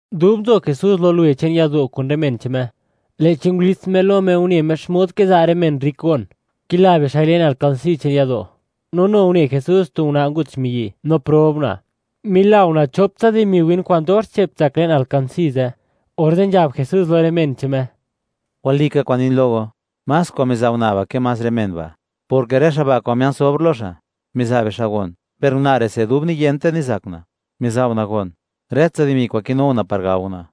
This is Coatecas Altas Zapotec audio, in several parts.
Dub nzo Jesús lo luwe che'n yado' kun rë men che'n Me, lë'chi ngulits Me lo Me, une Me xmod kiza' rë men rrik gon, kila bixa'i le'n alkansí che'n yado', no nu une Jesús tu una' ngut xmiyi', no prob una'; mila una' chop tsa dimi win kwa'n dox che'p tsak le'n alkansí ze', orze' nzhab Jesús lo rë men che'n Me: ―Walika kwa'n nin lo go, más kwa'n miza' una' ba' ke más rë men ba', porke rë xa' ba', kwa'n mia'n sobr lo xa', miza' bixa' gon, per una' re'se, dub niyente nizak una', miza' una' gon, rë tsa dimi kwa'n kinu una' par gao una'.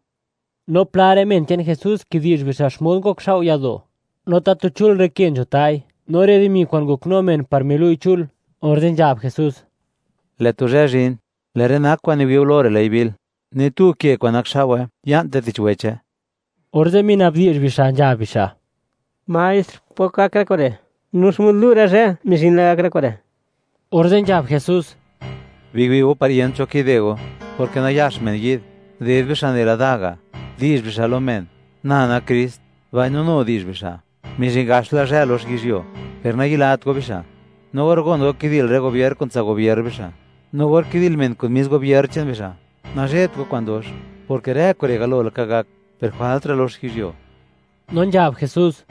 No pla rë men che'n Jesús, kidi'zh bixa' xmod ngokxao' yado', no tatu chul rë ke nzho ta'i, no rë dimi kwa'n ngoknu men, par milu'i chul, orze' nzhab Jesús: ―Lë' tu zhë zhin, lë' rë nak kwa'n kiwi' go lo rë, ley bil; ni tu ke kwa'n nakxao'we, ya'nte tich weche. Orze' minabdi'zh bixa', nzhab bixa': ―Maestr, ¿pok gak rë kure'? No, ¿xmod lu' rë zhë mizhin la gak rë kure'? Orze' nzhab Jesús: ―Biwi' go par yent cho kide go, porke nayax men yi'd, ded bixa' nela da ga', di'zh bixa' lo men: “Na nak Krist”; mbaino nu di'zh bixa': “Mizhin gaxla zhë lox yizhyuo”, per nayilat go bixa'. No or gon go kidil rë gobier, kun tsa' gubier bixa', no or kidil men kun mis gubier che'n bixa', nazhebt go kwa'n dox; porke rë kure' galo laka gak, per jwaltra' lox yizhyuo. No nzhab Jesús: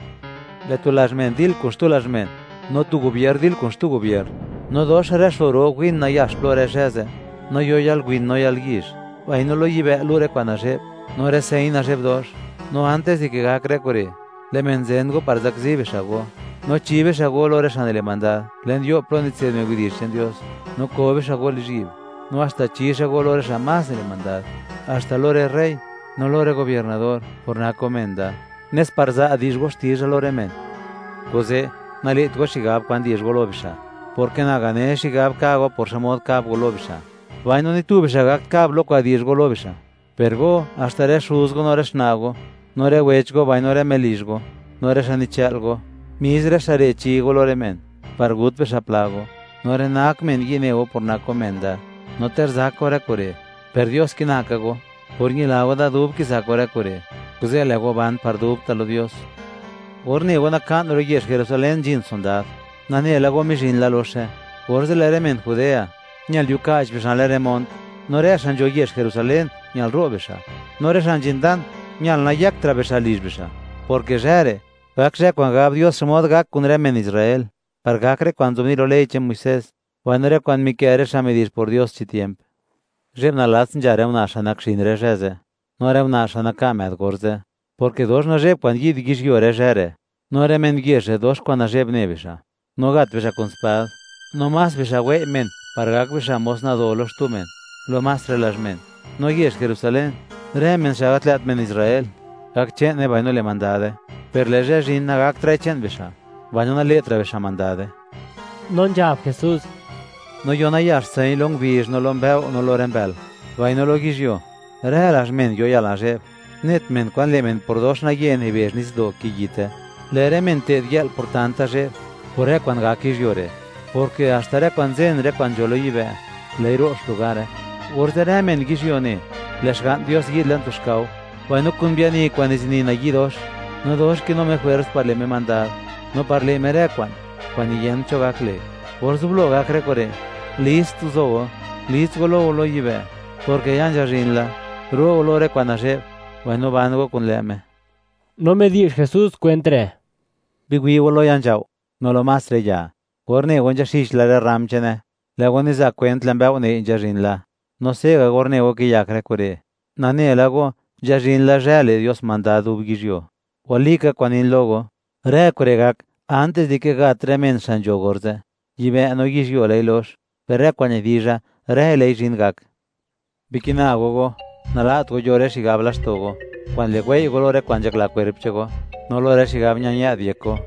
―Lë' tu lazh men dil kun xtu lazh men, no tu gubier dil kun xtu gubier, no dox rë xo ro win nayax plo, rë zhë ze', no yo yalwin no yalyizh; mbaino lo yibë' lu' rë kwa'n nazhe'b, no rë señ nazhe'b dox. ’No antis di ke gak rë kure', lë' men zen go par zakzi bixa' go, no chi bixa' go lo rë xa' nile' mandad le'n yo' plo nitse'd men widi'zh che'n Dios; no ko bixa' go lizhyi'b; no haxta chi xa' go lo rë xa' más nile' mandad, haxta lo rë rey no lo rë gobiernador, por nak go men da, nes par za' di'zh go xtizha lo rë men. Kuze', nale't go xigab kwan di'zh go lo bixa', porke na gane xigab ka' go, par xmod kab go lo bixa'; mbaino ni tu bixa' gakt kab lo kwa'n di'zh go lo bixa'. Per go, haxta rë xuz go, no rë xna' go no rë wech go, mbaino rë melizh go, no rë xa' nichë'l go; mis rë xa' re' chi go lo rë men, par gut bixa' pla go; no rë nak men yi' ne' go por nak go men da; no ter zak go rë kure', per Dios kina ka go. Por ñila go da dub kizak go rë kure', kuze' le' go ban par dubta' lo Dios. ’Or ne go, naka'n ro' yezh Jerusalén nzhin sondad, nane la go mizhin la loxe, orze' lë' rë men Judea, ñal yuka'ch bixa' le'n rë mont, no rë xa' nzho yezh Jerusalén, ñal ro' bixa'; no rë xa' nzhin dan, ñal nayëktra' bixa' lizh bixa', porke zhë re', gak zhë kwa'n gab Dios xmod gak kun rë men Israel, par gak rë kwa'n nzobni' lo ley che'n Muisés mbaino rë kwa'n mikë' rë xa' midi'zh por Dios chi tiemp. ¡Zhe'b nalats, nzha rë una' xa' nak xin rë zhë ze', no rë una' xa' naka' më'd orze', porke dox nazhe'b kwa'n yi'd yizhyuo rë zhë re'; no rë men yezh re', dox kwa'n nazhe'b ne bixa'! No gat bixa' kun spad, no más bixa' wei' men, par gak bixa' mos nado lo xtu men, lo más rë lazh men; no yezh Jerusalén, rë men xa' gat lë't men Israel, gak che'ne mbaino le' mandade, per lë' zhë zhin, nagaktra'i che'n bixa', mbaino nale'tra' xa' mandade. No nzhab Jesús: ―No yo nayax señ lo ngubizh, no lo mbëo', no lo rë mbël. Mbaino lo yizhyuo, rë lazh men yo yalnazhe'b, net men kwan le' men por dox naye nibezh nitsdo' kiyite. Lë' rë men te'dyë'l por tanta zhe'b, por rë kwa'n gak yizhyuo re'; porke haxta rë kwa'n nzen rë kwa'n nzho lo yibë', lë'i ro' xlugare. Orze' rë men yizhyuo ne, lë' Xga'n Dios xa' nak ska tu men yizhyuo yi'd le'n tu xkao, mbaino kun biani kwa'n nizini nayi' dox, no dox kinu Me jwers par lë' Me mandad no par le' Me rë kwa'n, kwa'n niyent cho gak le'. Or zublo gak rë kure', list guzo go, gulits go lo go lo yibë', porke ya nzhazhin la, ro' go lo rë kwa'n nazhe'b, mbaino ban go kun lë' Me. No midi'zh Jesús kwent re': ―Biwi' go lo ya nzhao', no lo más rë ya; or ne go nzhaxichla rë rram che'ne, lë' go niza' kwent, lë' mbëo' nëi' nzhazhin la; no se'ga', or ne go, kiyak rë kure'; nane la go, nzhazhin la zhë, le' Dios mandad dub yizhyuo. ’Walika kwa'n nin lo go, rë kure' gak antis dike gat rë men xa' nzho orze'. Yibë' no yizhyuo lë'i lox; per rë kwa'n nidizha, rëi lë'i zhin gak. ’Bikina go go, nala't go yo rë xigab laxto' go, kwa'n le' wei' go lo rë kwa'n nzhakla kwerp che'n go, no lo rë xigab ña-ñë'd yek go,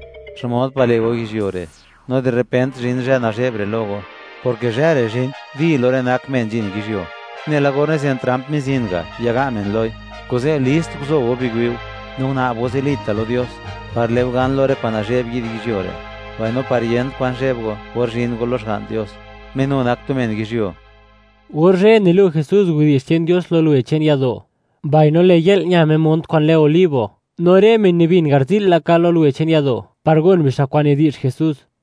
xmod pa' le' go yizhyuo re', no di repent zhin zhë nazhe'b re' lo go, porke zhë re' zhin ¡di! lo rë nak men nzhin yizhyuo, nela or nizen tramp mizin ga', yaga' men loi. Kuze' list guzou biwi'u, no guna'b go zilita' lo Dios, par le' go gan lo rë kwa'n nazhe'b yi'd yizhyuo re', mbaino par yent kwan zheb go, or zhin go lo Xga'n Dios, Me nu nak tu men yizhyuo. Or zhë, nilu' Jesús widi'zh che'n Dios lo luwe che'n yado', mbaino lë' yë'l, ña Me mont kwa'n lë Olivo. No rë men nibin garzi'l laka lo luwe che'n yado', par gon bixa' kwa'n nidi'zh Jesús.